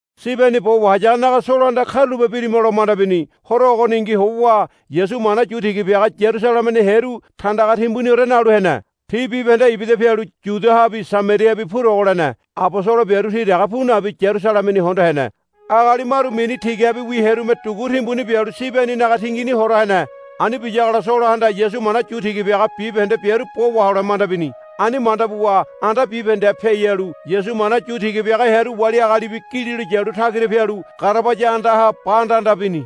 Sibeni bo wahayagonaga Solohanda, Karulape birima, lo manda bini. Horo ogoningi howa Yasu mana yu tiga biaga Yarusalemeni hearu tandaga timbuniore nalu hene. Ti bibahende ibida pialu Yudiahabi Samariahabi purogo lene. Abosolo biaru ti dege pu nabi Yarusalemeni hondo hene. Agali maru mini tigabiwi hearume dugu timbuni bialu Sibeninaga tingini hora hene. Ani biyagola Solohanda Yasu mana yu tiga biaga bibahende biaru bo wahole manda bini. Ani manda buwa anda bibahendeha piai halu Yasu mana yu tiga biaga hearu wali agalibi gililo yalu tagira pialu garabaya andaha ba andanda bini.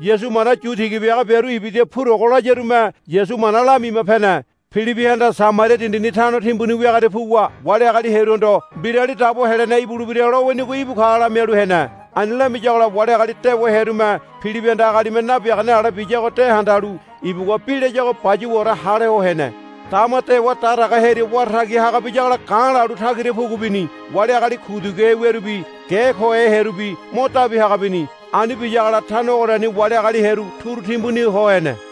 Yasu mana yu tiga biaga biaru ibida purogo layarume Yasu mana lamima pene. Pilibihanda Samaria dindini tano timbuni wiagoria puwa wali agali hearuhondo Mbirali Dabo Helene ibulebira lowinigo íbu ka lamialu hene. Ani lamiyagola wali agali dewa hearume Pilibihanda agalime nabiagane ale biyago de handalu ibugua bi layago bayuwaore hale ho hene. Dama dewa daraga hearia wara tagi haga biyagola ga̱ lalu tagira pugu bini. Wali agali kuduguhe wiarubi ge kohe hearubi mo dabi haga bini. Ani biyagola tano ogoriani wali agali hearu turu timbuni ho hene.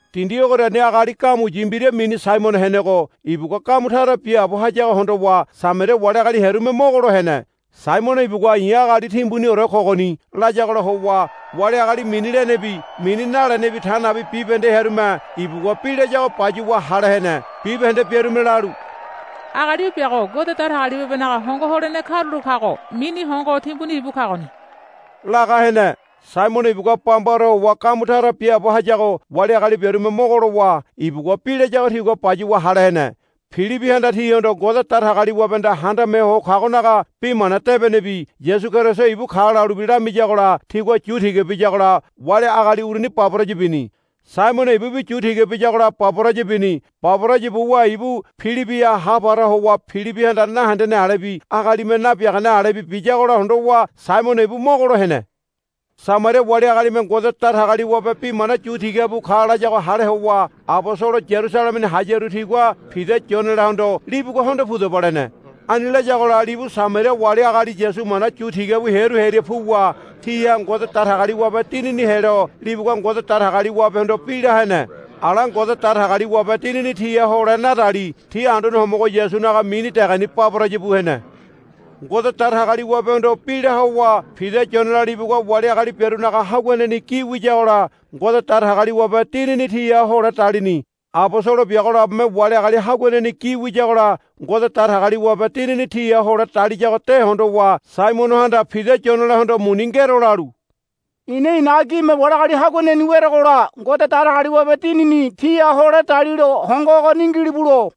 Dindi ogoriani agali gamuyi mbira mini Saimono henego ibugua gamu tara biaabo hayago hondowa Samaria wali agali hearume mogolo hene. Saimono ibugua, I̱ agali timbuniore kogoni, layagola howa wali agali mini lenebi mini nalenebi ta nabi bibahende hearume ibugua bi layago bayuwa hale hene. Bibahende biarume lalu, Agali o biago Ngode Datagaliwabenaga hongo holene karulo kago mini Hongo Timbuni ibu kagoni, laga hene. Saimono ibugua bambaore howa gamu tara biaabo hayago wali agali biarume mogo lowa ibugua bi layago tigua bayuwa hale hene. Pilibihanda tihondo Ngode Datagaliwabehanda Handame Ho Kagonaga bi mana debenebi Yasu Keriso íbu ka lalubi lamiyagola tigua yu tiga biyagola wali agali uruni baboraya bini. Saimono ibubi yu tiga biyagola baboraya bini. Baboraya buwa ibu Pilibiha hapara ho howa Pilibihanda nahendene alebi agalime nabiagane alebi biyagola hondowa Saimono ibu mogolo hene. Samaria wali agalime Ngode Datagaliwabe bi mana yu tiga bu ka layago hale howa abosolo Yarusalemeni hayaru tigua Pida Yonelahondo, Libugua hondo pudaba, lene. Ani layagola libu Samaria wali agali Yasu mana yu tiga bu hearu hearia puwa tiha Ngode Datagaliwabe Dinini helo libugua Ngode Datagaliwabehondo bi la hene. Ala Ngode Datagaliwabe Dinini tiha hole nadali ti Anduane Homogo Yasunaga mini degeni baboraya bu hene. Ngode Datagaliwabehondo bi la howa Pida Yonela libugua wali agali biarunaga haguaneni gi wiyagola Ngode Datagaliwabe Dinini tiha hole dalini. Abosolo biago labome wali agali haguaneni gi wiyagola Ngode Datagaliwabe Dinini tiha hole daliyago de hondowa Saimonohanda Pida Yonelahondo, Muni ngero, lalu, I̱na i̱naga gime wali agali haguaneni werogola Ngode Datagaliwabe Dinini tiha hole dalilo hongo ogoni ngilibulo,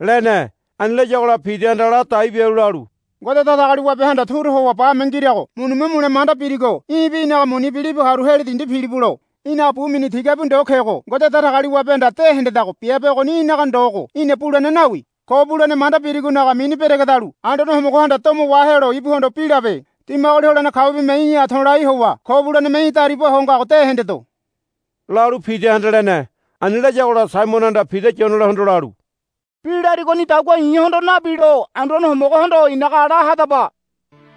lene. Ani layagola Pidahanda ladai bialu lalu, Ngode Datagaliwabehanda turu howa bame ngirago munime mule manda birigo í̠bi í̠naga munibi libu haru heli dindi pilibulo. Í̠naga bu mini tigabi ndo kego Ngode Datagaliwabehanda de hendedago biabe ogoni í̠naga ndogo í̠na bulene nawi. Ko bulene manda birigonaga mini beregedalu Anduane Homogohanda domo wahelo ibuhondo bi labe. Dimagoli holene kaubime í̠ha to̱lai howa ko buleneme í̠ dariba ho ngago de hendedo, lalu Pidahanda lene. Ani layagola Saimonohanda Pida Yonelahondo lalu, Bi larigonidagua i̱hondo nabilo Anduane Homogohondo i̱naga la hadaba,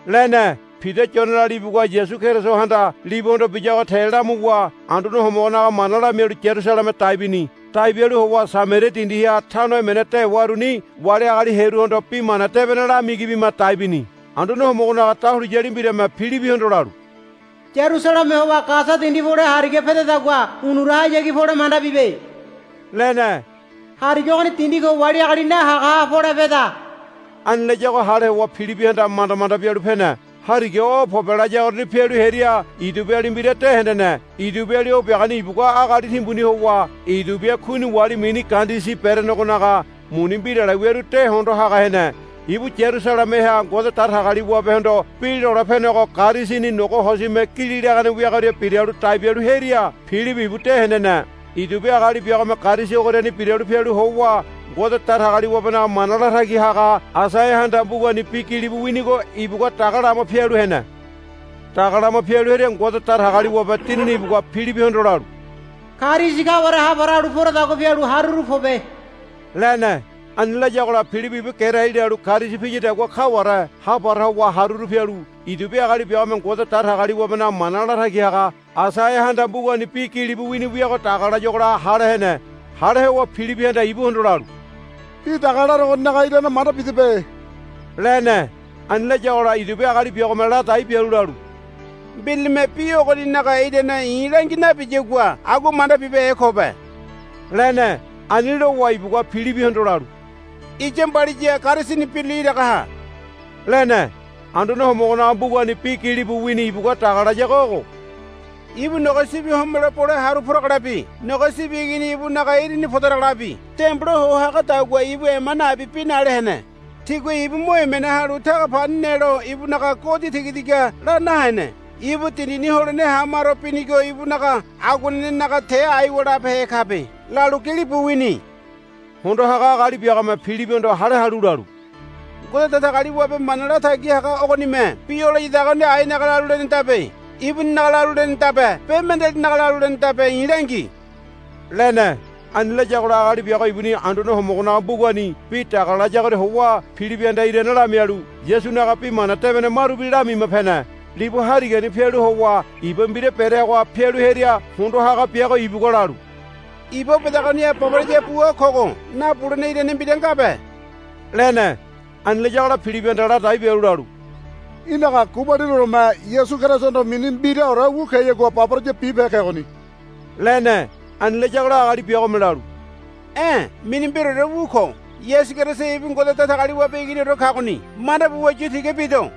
lene. Pida Yonela libugua Yasu Kerisohanda libuhondo biyago te lamuwa Anduane Homogonaga mana lamialu Yarusaleme dai bini. Dai bialu howa Samaria dindiha tano emene dewaruni wali agali hearuhondo Bi Mana Debene lamigi bima dai bini. Anduane Homogonaga dahuliyali mbirame Pilibihondo lalu, Yarusaleme howa Gasa dindi pole hariga pedadagua unurahayagi pole manda bibe, lene. Hariga ogoni dindi ko wali agali nahagaha pole peda. Ani layago hale howa Pilibihanda manda manda bialu pene. Hariga o pobe layagoriani pialu hearia Idiobiali mbira de hendene. Idiobiali o biagoni ibugua agali timbuni howa Idiobia Kuini wali mini Kandesi berenegonaga muni mbirale wiaru de hondo haga hene. Ibu Yarusalemeha Ngode Datagaliwabehondo bi lole penego karisini nogo hosime gili lagane wiagoria biralu dai bialu hearia Pilibi ibu de hendene. Idiobia agali biagome karisi ogoriani biralu pialu howa Ngode Datagaliwabenaga mana latagi haga Aisaiahanda mbugani bi gilibu winigo ibugua daga lama pialu hene. Daga lama pialu hearia Ngode Datagaliwabe Dinini ibugua Pilibihondo lalu, Karisi kaware hapara halu poradagua pialu haruru pobe, lene. Ani layagola Pilibi ibu gerai lalu karisi piyadagua kaware hapara howa haruru pialu Idiobia agali biagome Ngode Datagaliwabenaga mana latagi haga Aisaiahanda mbugani bi gilibu wini wiago daga layuagola hale hene. Hale howa Pilibihanda ibuhondo lalu, Bi daga laregoninaga irane manda bidebe, lene. Ani layagola Idiobia agali biagome ladai bialu lalu, Mbiralime bi ogoninaga irane i̱ langi nabiyagua agua manda bibehe kobe, lene. Ani lowa ibugua Pilibihondo lalu, Iya mbaliya karisini birule iraga ha, lene. Anduane Homogonaga mbugani bi gilibu wini ibugua daga layago ogo, Ibu nogo sibi homelo bole haru poragolabi nogo sibi igini ibunaga irini podaragolabi dembola ho hagadagua ibu ema nabi bi nale hene. Tigua ibu mo emene halu taga pani nelo ibunaga godi tigatiga la nahene. Ibu dindini holene hamaro binigo ibunaga aguanenenaga te aiwa labehe kabe, lalu gilibu wini. Hondo haga agali biagome Pilibihondo hale halu lalu, Ngode Datagaliwabe mana latagi haga ogonime bi o layadagoni ainaga lalu lenedabe. Ibuninaga lalu lenedabe be mendealinaga lalu lenedabe i̱ langi, lene. Ani layagola agali biago ibuni Anduane Homogonaga mbugani bi daga layagoria howa Pilibihanda irane lamialu Yasunaga Bi Mana Debene marubi lamima pene. Libu harigani pialu howa iba mbira bereagoha pialu hearia hondo haga biago ibugua lalu, Iba o bedagoniha baboraya bua kogo nabulene irane mbira ngabe, lene. [ Ani layagola Pilibihanda ladai bialu lalu, Í̠naga gubalinioreme Yasu Kerisohondo mini mbiraore wu keyagua baboraya bibehe kegoni, lene. Ani layagola agali biagome lalu, E̱ mini mbiraore wu ko. Yasu Keriso ibu Ngode Datagaliwabe Iginiore kagoni manda buwa yu tiga bido,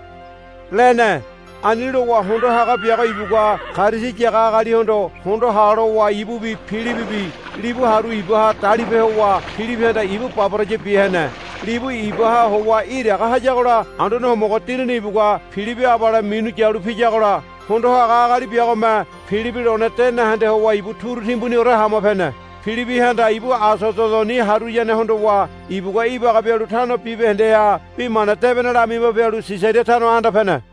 lene.] Ani lowa hondo haga biago ibugua karisi yaga agalihondo, Hondo ha, lowa ibubi Pilibibi libu haru ibaha dalipe howa Pilibihanda ibu baboraya bia hene. Libu ibaha howa iraga hayagola Anduane Homogo Dinini ibugua Pilibi abale minu yalu piyagola hondo haga agali biagome Pilibi lone de nahende howa ibu turu timbuniore hama pene. Pilibihanda ibu Asododoni haruyane hondowa ibugua ibaga bialu tano bibahendeha Bi Mana Debene lamima pialu Sisaria tano anda pene.